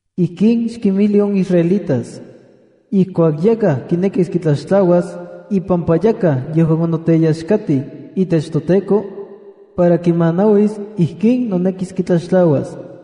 “Ijkin xkinmijli on israelitas: ‘Ijkuak yakaj kinekis kitlaxtlauas ipampa yajkaj yejuan onoteyaxkatij itech toTEKO, para kimanauis ijkin nonekis kitlaxtlauas: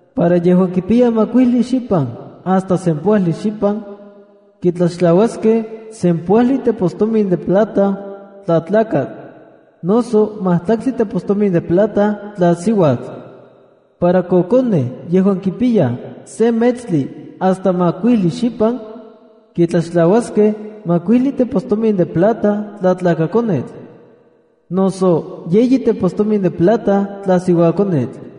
Para yejuan kipiyaj makuijli xipan hasta sempoajli xipan, kitlaxtlauaskej sempoajli tepostomin de plata tla tlakatl, noso majtlaltli tepostomin de plata tla siuatl. Para kokonej yejuan kipiyaj se metstli hasta makuijli xipan, kitlaxtlauaskej majkuijli tepostomin de plata tla tlakakonetl, noso yeyi tepostomin de plata tla siuakonetl.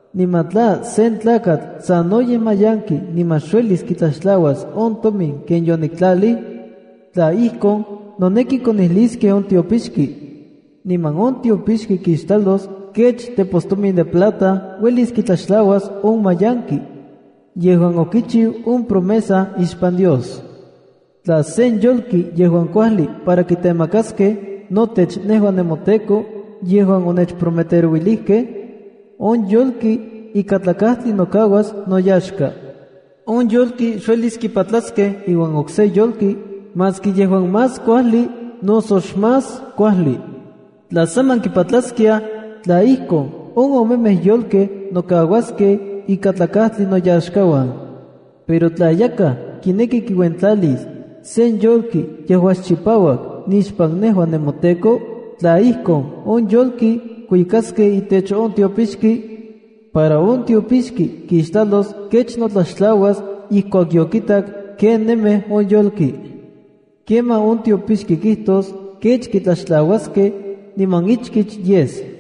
Niman tla sen tlakatl sanoyej mayanki niman xuelis kitlaxtlauas on tomin ken yoniktlalij, tla ijkon, noneki konijliskej on tiopixki. Niman on tiopixki kixtlalos kech tepostomin de plata uelis kitlaxtlauas on mayanki yejuan okichiu on promesa ixpan Dios. ’Tla sen yolki yejuan kuajli para kitemakaskej notech nejua nemoTEKO yejuan onechprometerouilijkej, on yolki ikatlakajtli nokauas noyaxka. On yolki xuelis kipatlaskej iuan okse yolki maski yejuan más kuajli noso xmás kuajli. Tla saman kipatlaskiaj, tla ijkon, on omemej yolkej nokauaskej ikatlakatli noyaxkauan. ’Pero tla yakaj kineki kiuentlalis sen yolki yejuan xchipauak nixpan nejua nemoTEKO, tla ijkon, on yolki kuikaskej itech on tiopixki, para on tiopixki kixtlalos kech notlaxtlauas ijkuak yokitak kenemej on yolki. Kemaj on tiopixki kijtos kech kitlaxtlauaskej, niman ichkich yes.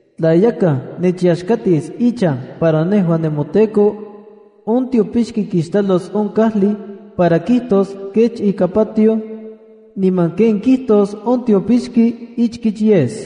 ’Tla yakaj nechyaxkatis ichan para nejua nemoTEKO, on tiopixki kixtlalos on kajli para kijtos kech ika patioj, niman ken kijtos on tiopixki ichkich yes.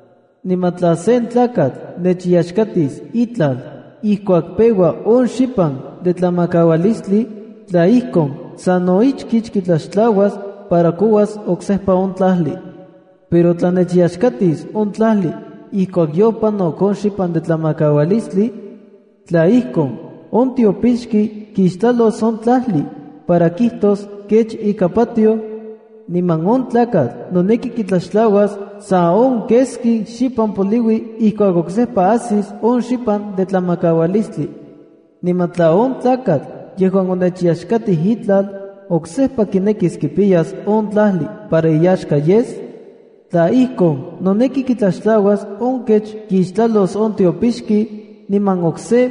Niman tla sen tlakatl nechyaxkatis itlal ijkuak peua on xipan de tlamakaualistli, tla ijkon, sano ichkich kitlaxtlauas para kouas oksejpa on tlajli. Pero tla nechyaxkatis on tlajli ijkuak yopanok on xipan de tlamakaualistli, tla ijkon, on tiopixki kixtlalos on tlajli para kijtos kech ika patioj, niman on tlakatl noneki kitlaxtlauas sa on keski xipan poliui ijkuak oksejpa ajsis on xipan de tlamakaualistli. ’Niman tla on tlakatl yejuan onechyaxkatij itlal oksejpa kinekis kipiyas on tlajli para iyaxka yes, tla ijkon, noneki kitlaxtlauas on kech kixtlalos on tiopixki niman okse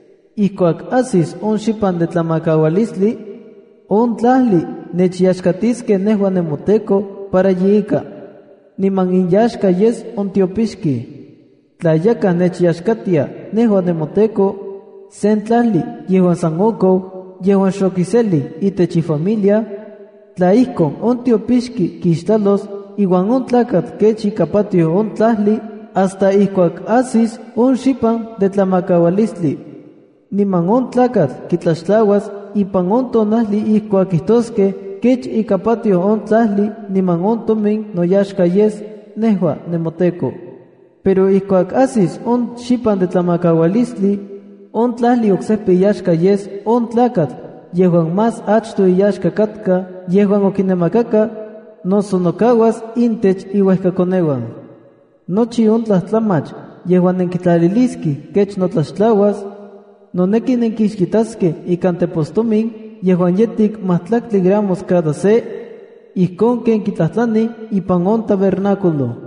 Ijkuak ajsis on xipan de tlamakaualistli, on tlajli nechyaxkatiskej nejua nemoTEKO para yeika, niman inyaxka yes on tiopixkej. ’Tla yakaj nechyaxkatia, nejua nemoTEKO, sen tlajli yejuan san okou yejuan xokiselij itech ifamilia, tla ijkon, on tiopixki kixtlalos iuan on tlakatl kech ika patioj on tlajli hasta ijkuak ajsis on xipan de tlamakaualistli. Niman on tlakatl kitlaxtlauas ipan on tonajli ijkuak kijtoskej kech ika patioj on tlajli niman on tomin noyaxka yes, nejua nemoTEKO. Pero ijkuak ajsis on xipan de tlamakaualistli, on tlajli oksejpa iyaxka yes on tlakatl yejuan más achtoj iyaxka katka yejuan okinamakaka, noso nokauas intech iuejkakoneuan. ’Nochi on tlajtlamach yejuan nenkitlaliliskej kech notlaxtlauas, noneki nenkixitaskej ikan tepostomin yejuan yejtik majtlaktli gramos cada se, ijkon ken kitlajtlanij ipan on tabernáculo.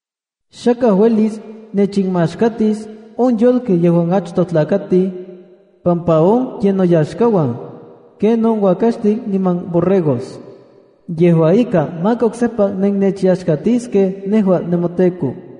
’Xakaj uelis nechinmaxkatis on yolkej yejuan achtoj tlakatij, pampa on ye noyaxkauan, ken on uakaxtin niman borregos. Yejua ika, maka oksejpa nennechyaxkatiskej nejua nemoTEKO.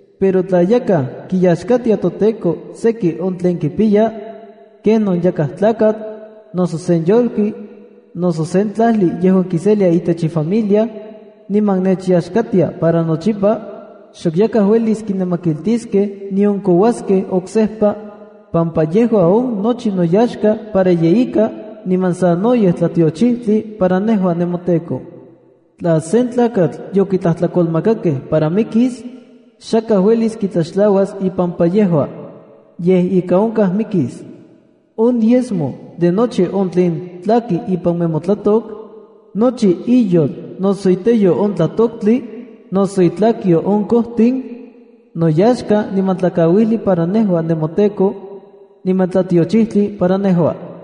’Pero tla yakaj kiyaxkatia toTEKO seki on tlen kipiya, kenon yakaj tlakatl, nose sen yolki, noso sen tlajli yejuan kiselia itech ifamilia, niman nechyaxkatia para nochipa, xok yakaj uelis kinamakiltiskej nion kouaskej oksejpa, pampa yejua on nochi noyaxka para yeika niman sanoyej tlatiochijtli para nejua nemoTEKO. Tla sen tlakatl yokitlajtlakolmakakej para mikis, xakaj uelis kitlaxtlauas ipampa yejua. Yej, ika onkaj mikis. ’On diezmo de nochi on tlen tlaki ipan nemotlatok, nochi iyol noso iteyo on tlatoktli, noso itlakyo on kojtin, noyaxka niman tlakauijli para nejua nemoTEKO, niman tlatiochijtli para nejua.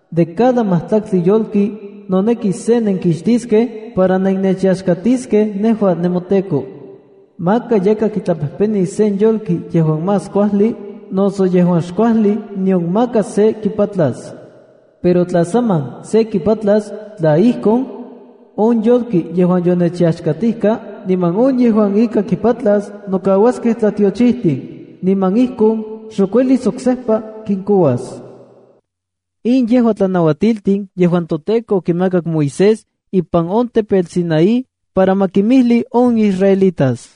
’De cada majtlaktli yolki noneki se nenkixtiskej para nennechyaxkatiskej nejua nemoTEKO. Maka yakaj kitlapejpenis sen yolki yejuan más kuajli noso yejuan xkuajli nion maka se kipatlas. Pero tla saman se kipatlas, tla ijkon, on yolki yejuan yonechyaxkatijka niman on yejuan ika kipatlas, nokauaskej tlatiochijtin niman ijkon xok uelis oksejpa kinkouas.” In yejua tlanauatiltin yejuan toTEKO okimakak Moisés ipan on tepetl Sinaí para ma kimijli on israelitas.